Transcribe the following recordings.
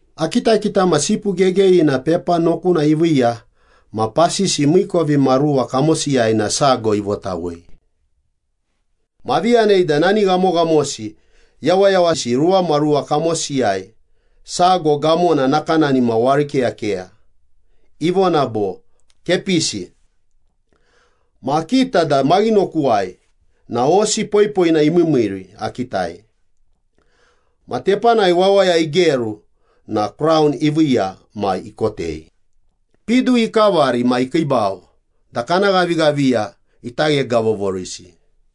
Akitakita ma Sipu Gegeyina pepa nokuna iviiya ma pasisi miikovimaruwa kamosiyai na sago ivotawei. Ma avi yanei da nani ghamoghamosi yawayawasi ruwamaruwa kamosiyai, sago gamona nakanani ma warikeyakeya, ivona bo, “Kepisi.” Ma akita da maghinokuwai na hosi poipoina imiimiiri akitai. Ma tepanai wawaya igeru na kraun iviiya ma ikotei, pidu ikavari ma ikiibau da kana ghavighaviya ita ghegavovorisi.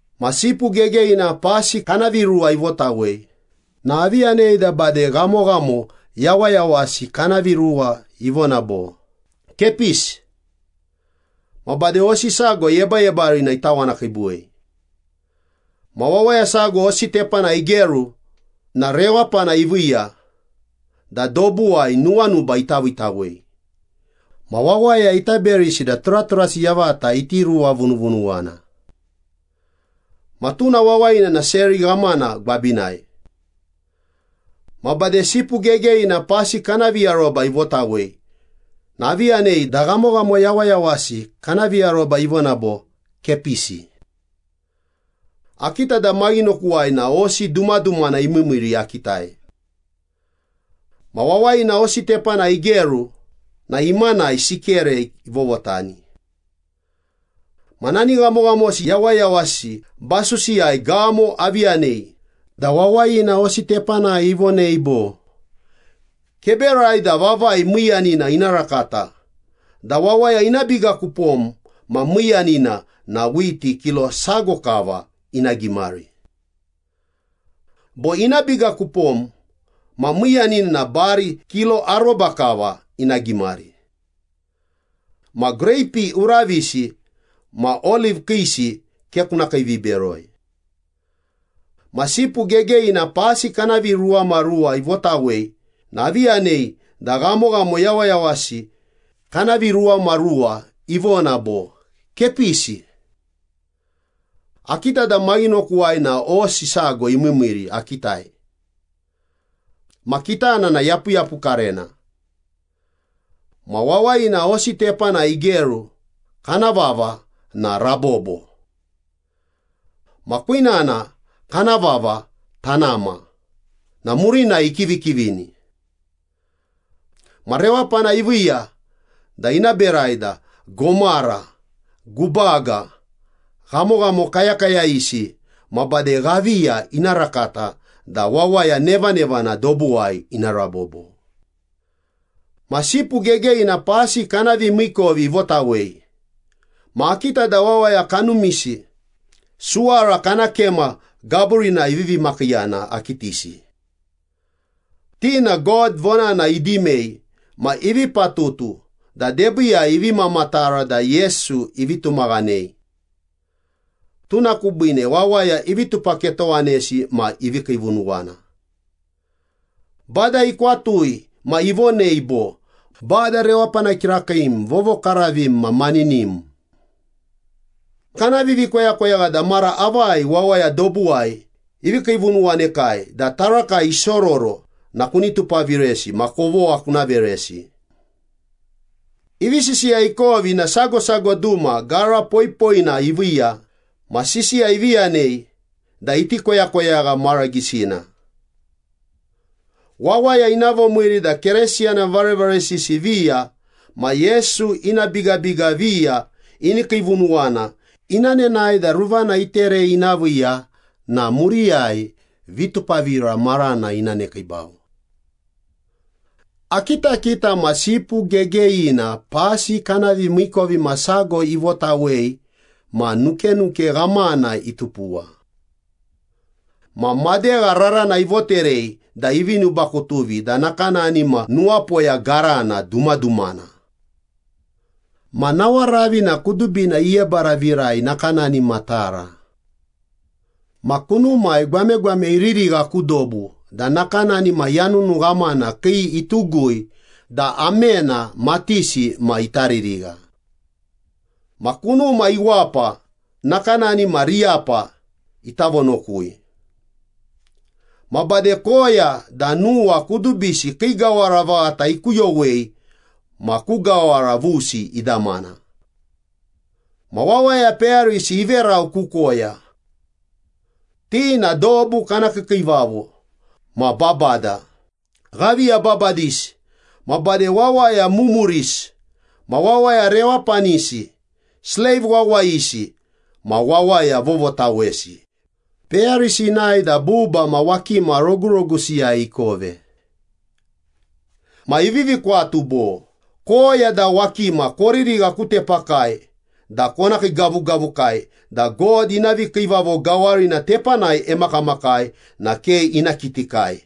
Ma Sipu Gegeyina pasi kana viruwa ivotawei na avi yanei da bade ghamoghamo yawayawasi kana viruwa ivona bo, “Kepisi.” Ma bade hosi sago yebayebarina itawanakiibuwei. Ma wawaya sago hosi tepanai igeru na rewapana iviiya da dobuwai nuwanuba ita viitawei ma wawaya ita berisi da turaturasi yavata iti ruwavunuvunuwana. Ma tuna wawayina na seri ghamana gwabinai. Ma bade Sipu Gegeyina pasi kana viaroba ivotawei na avi yanei da ghamoghamo yawayawasi kana viaroba ivona bo, “Kepisi.” Akita da maghinokuwai na hosi dumadumana imiimiiri akitai. Ma wawayina hosi tepanai igeru na imanai sikere ivovotani. Ma nani ghamoghamosi yawayawasi basusiyai gamo avi yanei da wawayina hosi tepanai ivonei bo, “Keberai da vavai miiyiina ina rakata da wawaya ina biga ku pom ma miiyanina na whiti kilo sago kava ina gimari. Bo ina biga ku pom ma miiyanina na bari kilo aroba kava ina gimari. Ma greipi uravisi ma oliv kiisi ke kuna kiiviberoi.” Ma Sipu Gegeyina pasi kana viruwamaruwa ivotawei na avi yanei da ghamoghamo yawayawasi kana viruwamaruwa ivona bo, “Kepisi.” Akita da maghinokuwai na hosi sago imiimiiri akitai. Ma kitana na yapuyapukarena. Ma wawayina hosi tepanai igeru kana vava na ‘Rabobo.’ Ma kwinana kana vava ‘Tanama’ na murinai ikivikivini. Ma rewapana iviiya da ina berai da gomara, gubaga, ghamoghamo kayakayayisi ma bade ghaviya ina rakata da wawaya nevanevana dobuwai ina rabobo. Ma Sipu Gegeyina pasi kana vimiikovi ivotawei ma akita da wawaya kanumisi suwara kana kema gaburinai ivivi makiiyana akitisi. Ti na God vonana idimei ma ivi patutu da debiiyai ivi mamatara da Yesu ivi tumaghanei. Tuna kubiine wawaya ivi tupaketowanesi ma ivi kiivunuwana. Bada ikwatui ma ivonei bo, “Bada rewapana kirakiim, vovokaravim ma maninim. Kana vivikoyakoyagha da mara avai wawaya dobuwai ivi kiivunuwanekai da tarakai isororo na kuni tupaviresi ma kovogha kuna veresi.” Ivi sisiya ikovi na sago sago duma gara poipoina iviiya ma sisiya ivi yanei da iti koyakoyagha mara gisina. Wawaya ina vomiiri da Keresiyana varevaresisi viya ma Yesu ina bigabiga viya ini kiivunuwana ina nenae da ruvana iterei ina viiya na muriyai vitupavira marana ina nekiibau. Akitakita ma Sipu Gegeyina pasi kana vimiikovimasago ivotawei ma nukenuke ghamana itupuwa. Ma madegha rarana ivoterei da ivi nubakutuvi da nakanani ma nuwapoya garana dumadumana. Ma nawaravi na kudubina iyebaravirai nakanani ma tara. Ma kunumai gwamegwame iririgha ku dobu da nakanani ma yanunu ghamana kii itugui da amena matisi ma ita ririgha. Ma kunuma iwapa nakanani ma riyapa ita vonokui. Ma bade koya da nuwa kudubisi kii gawara vaghata ikuyowei ma ku gawara vusi idamana. Ma wawaya peyarisi iverau ku koya. Ti na dobu kana kiikiivavo ma babada, ghaviya babadisi, ma bade wawaya mumurisi ma wawaya rewapanisi, sleiv wawayisi ma wawaya vovotawesi, peyarisi inae da buba ma wakima rogurogusiyai ikove. Ma ivivi kwatu bo, “Koya da wakima koririgha ku tepakai da kona kiigavugavukai da God ina vikiivavo gawarina tepanai emakamakai na ke ina kitikai,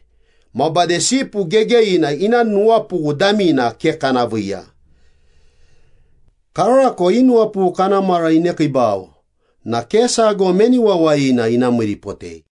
ma bade Sipu Gegeyina ina nuwapughu damina ke kana viiya. Karako i nuwapughu kana mara inekiibau na ke sago meni wawayina ina miiripotei.”